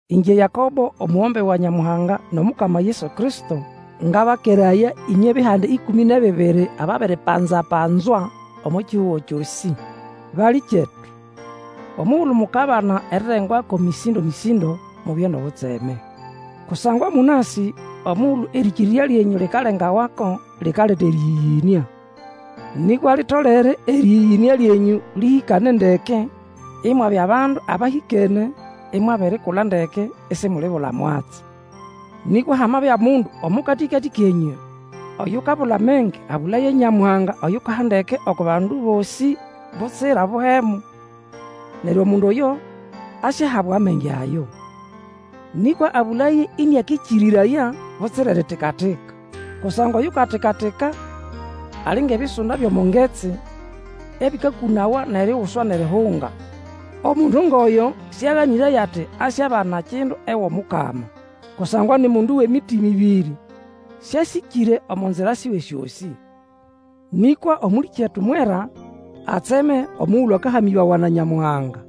Ĩngye Yakobo, omugombe wa Nyamuhanga nʼOmukama Yesu Kristo, ngabakeraya ĩnywe bihanda ĩkũmĩ nʼebibiri ababiripanza-panzwa omo kihugo kyosĩ. Balĩkyetu, omugulu mukabana erirengwako mĩsĩndo-mĩsĩndo, mubye nʼobutseme. Kusangwa mũnasĩ omugulu erĩkĩrĩrya lyenyũ likalengawako, likaleta erĩyĩyĩnĩa. Nĩkwa litolere erĩyĩyĩnĩa lyenyũ lĩhĩkane ndeke, imwabya bandu abahĩkene imwabirikula ndeke, isimulibula mwatsi. Nĩkwa hamabya mundu omo katĩkatĩ kenyũ oyukabula amenge, abũlaye Nyamuhanga oyukaha ndeke oko bandu bosĩ butsira buhemu; neryo omundu oyo asyahabwa amenge ayo. Nĩkwa abũlaye ĩnĩakĩkĩrĩraya, butsira eritika-tika. Kusangwa oyukatika-tika ali ngʼebisunda byʼomo ngetsi, ebĩkakũnawa nʼeriguswa nʼerihunga. Omundu ngʼoyo sĩaganĩraye ati asyabana kindu ewʼOmukama. Kusangwa ni mundu wʼemitima ĩbĩrĩ, sĩasĩkĩre omo nzira siwe syosĩ. Nĩkwa Omũlĩkyetu mwera atseme omugulu akahamĩbawa na Nyamuhanga.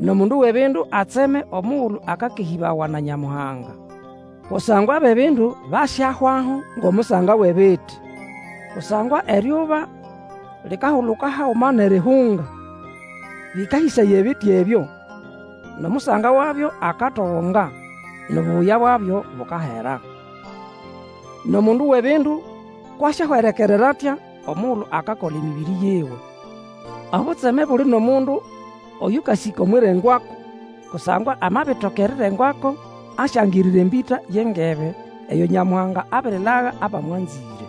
Nʼomundu wʼebindu atseme omugulu akakehĩbawa na Nyamuhanga. Kusangwa abʼebindu basyahwaho ngʼomusanga wʼebiti. Kusangwa eryuba likahuluka haguma nʼerihunga, bĩkahĩsaya ebiti ebyo, nʼomusanga wabyo akatogonga, nʼobubuya bwabyo bukamera. Nʼomundu wʼebindu kwʼasyahwerekerera atya omugulu akakola emĩbĩrĩ yiwe. Obutseme buli nʼomundu oyũkasĩka omwʼirengwako, kusangwa amabitoka erirengwako asyangirira embĩta yʼengebe, eyo Nyamuhanga abirilaga abamwanzĩre.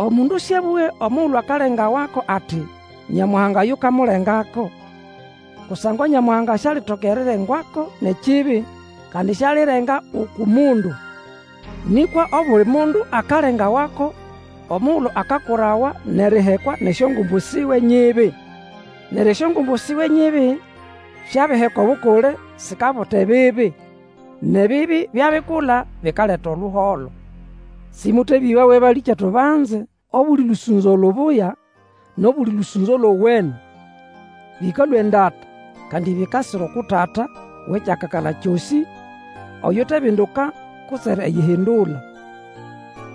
Omundu sĩabũge omugulu akalengawako ati, Nyamuhanga yukamulengako, kusangwa Nyamuhanga sialitoka erirengwako nʼekibi, kandi sialirenga uku mundu. Nĩkwa obuli mundu akalengawako omugulu akakurawa nʼerihekwa nʼesyongumbu siwe nyibi. Neryo esyongumbu siwe nyibi syabiheka obukule, sikabuta ebibi, nʼebibi byabikula, bikaleta oluholo. Sĩmũtebĩbawe, balĩkyetu banze. Obuli lũsũnzo lubuya nʼobuli lũsũnzo lowene, bĩkalũa endata, kandi bikasira uku Tata wʼekyakakala kyosĩ, oyutebinduka kutse eriyihindula.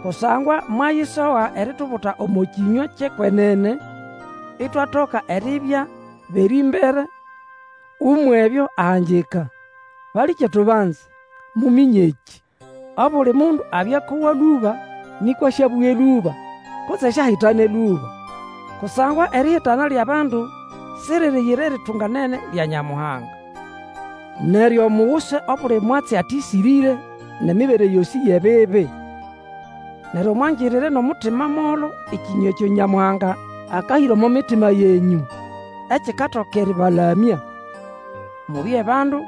Kusangwa mwayisoga eritubuta omo kĩnywa kyʼekwenene itwatoka eribya bʼerĩmbere umwʼebyo ahangika. Balĩkyetu banze, muminye ekĩ. Obuli mundu abye akowa lũba, nĩkwa sĩabũge lũba, kutse siahitane lũba. Kusangwa erihitana lyʼabandu siririyira eritunganene lya Nyamuhanga. Neryo muguse obuli mwatsi atĩsĩrĩre, nʼemibere yosĩ yʼebibi. Neryo mwangirire nʼomutima molo ekĩnywa ekyo Nyamuhanga akahĩra omo mitima yenyũ, ekikatoka erĩbalamya. Mubye bandu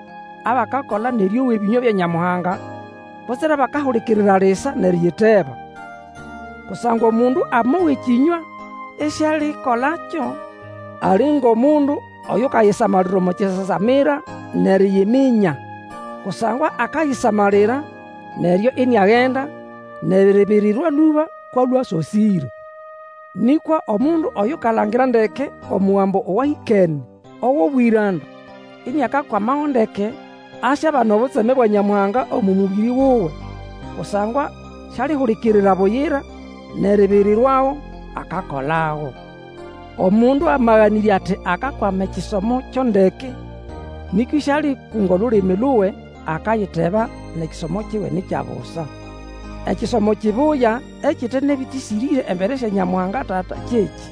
abakakola nʼerĩowa ebĩnywa bya Nyamuhanga, butsira abakahulikirira lisa nʼeriyiteba. Kusangwa omundu amowa ekĩnywa isialikolakyo, ali ngʼomundu oyukayisamalira omo kisasamira nʼeriyiminya; kusangwa akayisamalira, neryo iniagenda, nʼeribirirwa lũba kwʼalwe asosĩre. Nĩkwa omundu oyukalangira ndeke omugambo owahĩkene, owʼobwĩranda, iniakakwamago ndeke, asyabana obutseme bwa Nyamuhanga omo mũbĩrĩ wuwe, kusangwa sialihulikirira buyira nʼeribirirwago; akakolago. Omundu amaganĩrya ati akakwama ekisomo kyo ndeke, nĩkwa isialikunga olulimi luwe, akayiteba, nʼekisomo kiwe ni kya busa. Ekisomo kibuya, ekite nʼebĩtĩsĩrĩre embere sya Nyamuhanga Tata kyekĩ: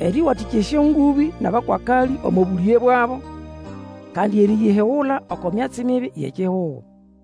erĩwatĩkya esyongũbĩ nʼabakwakalĩ omo bũlĩge bwabo, kandi eriyihigula oko myatsi mibi yʼekihugo.